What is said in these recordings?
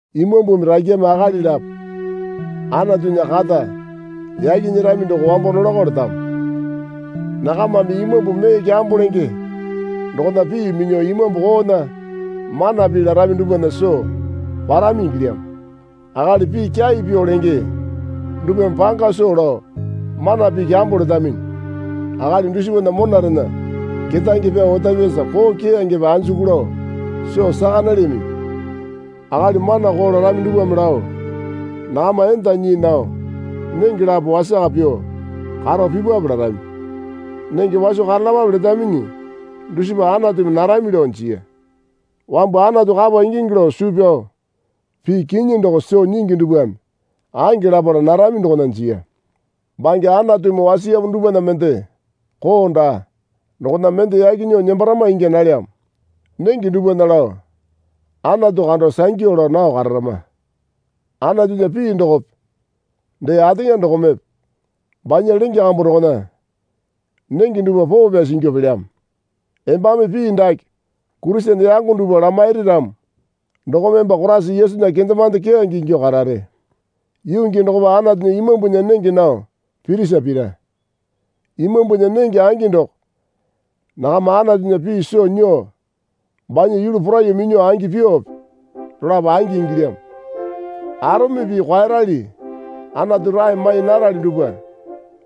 Imambumi rakyame akali lapo Anatunya kata yaki nyerami doko wambo nolakao letamo. Nakamame imambu mee kyambo lenge dokona pii minyuo imambu koona mana pii larami dupwana soo parami ingilyamo. Akali pii kyai pyuo lenge dupwame panga soo lao mana pii kyambo letaminyi. Akali dusipana monarena kerange pyao otapyasa koo keyangepe anjuku lao soo saka nalyaminyi. Akali mana koo larami dupwame lao nakama enda nyii nao nenge lapo wasaka pyuo karo pipwape larami. Nenge waso karalapape letaminyi dusipa Anatumi narami lao jiya. Wambu Anatu kapa ingingi lao suu pyao pii kinyi doko soo nyingi dupwame ange lapala narami dokona jiya. Bange Anatumi wasiyamo dupwana mende koo daa. Dokona mende yaki nyuo nembarama ingya nalyamo. Nenge dupwana lao Anatu kando sangyu lao nao kararama. Anatunya pii dokope dee ateŋa dokomepe banya lenge kambu dokona nenge dupwa poo pyasi ingyuo pelyamo. Embame pii dake Kurisene yango dupwa lamairi ramo dokome emba Koraisa Yesunya kendemande keyange ingyuo karare. Yuu gii dokopa Anatunya imambunya nenge nao pirisa pira. Imambunya nenge angi doko nakama Anatunya pii soo nyuo banya yulu poraiyuo minyuo angi pyuope dolapo angi ingilyamo. Arome pii kwaeyarali Anatu rae mai narali dupwa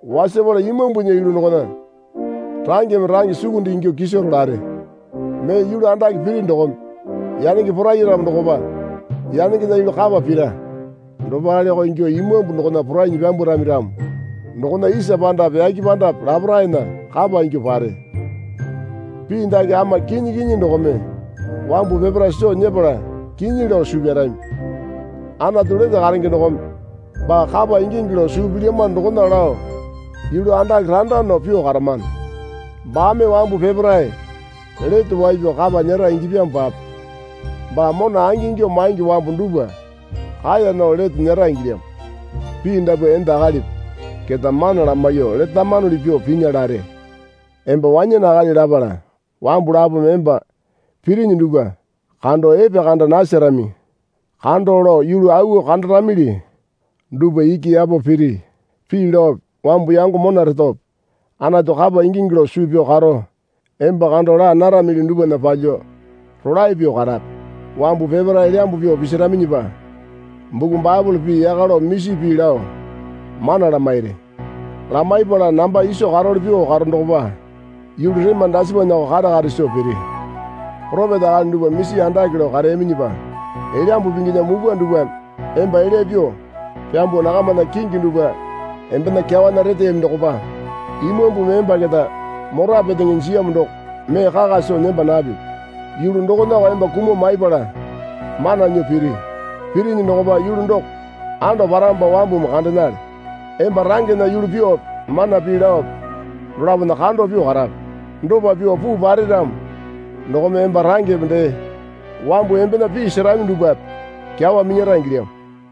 wasapala Imambunya yulu dokona rangeme range sukunde ingyuo kiso rolare. Mee yulu andake piri dokome yanenge poraiyaramo dokopa yanengena yulu kapa pira. Dopaleko ingyuo imambu dokona porainyi pyambwarami ramo dokona isa pandape yake pandape laparaena kapa ingyuo pare. Pii dake ama kinyi kinyi dokome wambu peparae soo nyepala kinyi lao suu pyarami. Anatu lete karenge dokome baa kapa ingingi lao suu pilyamano dokona lao yulu andake randa nao pyuo karamano. Baame wambu peparae lete wai pyao kapa nyera ingyapyamopape baa mona angingyuo maingi wambu dupwa kaeya nao lete nyera ingilyamo. Pii dapwa enda akalipi keta mana lamaiyuo letamanuli pyuo pinya lare. Emba wanyane akali lapala wambu lapome emba pirinyi dupwa kando epekanda nasarami kando lao yulu auwo kandaramili dupwa iki yapo piri. Pii laope wambu yango mona retope Anatu kapa ingingi lao suu pyao karo emba kando laa naramili dupwana palyuo rolae pyuo karape. Wambu peparae elyambu pyuo pisiraminyipa buku Baepole pii yaka lao misi pii lao mana lamairi. Lamaipala namba iso karowale pyuo karo dokopa yulu rema dasipanako kare kare soo piri. Poropeta akali dupwa misi andake lao kareyaminyipa Elyambu Pinginya mupwa dupwame emba elya pyuo pyambuo nakamana kingi dupwa embena kyawana reteyami dokopa Imambumi emba keta mora petenge jiyamo doko mee kaka soo nemba napipi. Yulu dokonako emba kumuo maipala mana nyuo piri. Pirinyi dokopa yulu doko ando paramopa wambumi kandenale. Emba rangena yulu pyuope mana pii laope dolapona kando pyuo karape. Dopa pyuo puu pare ramo dokome emba rangepe dee wambu embena pii serami dupwape kyawa minyara ingilyamo.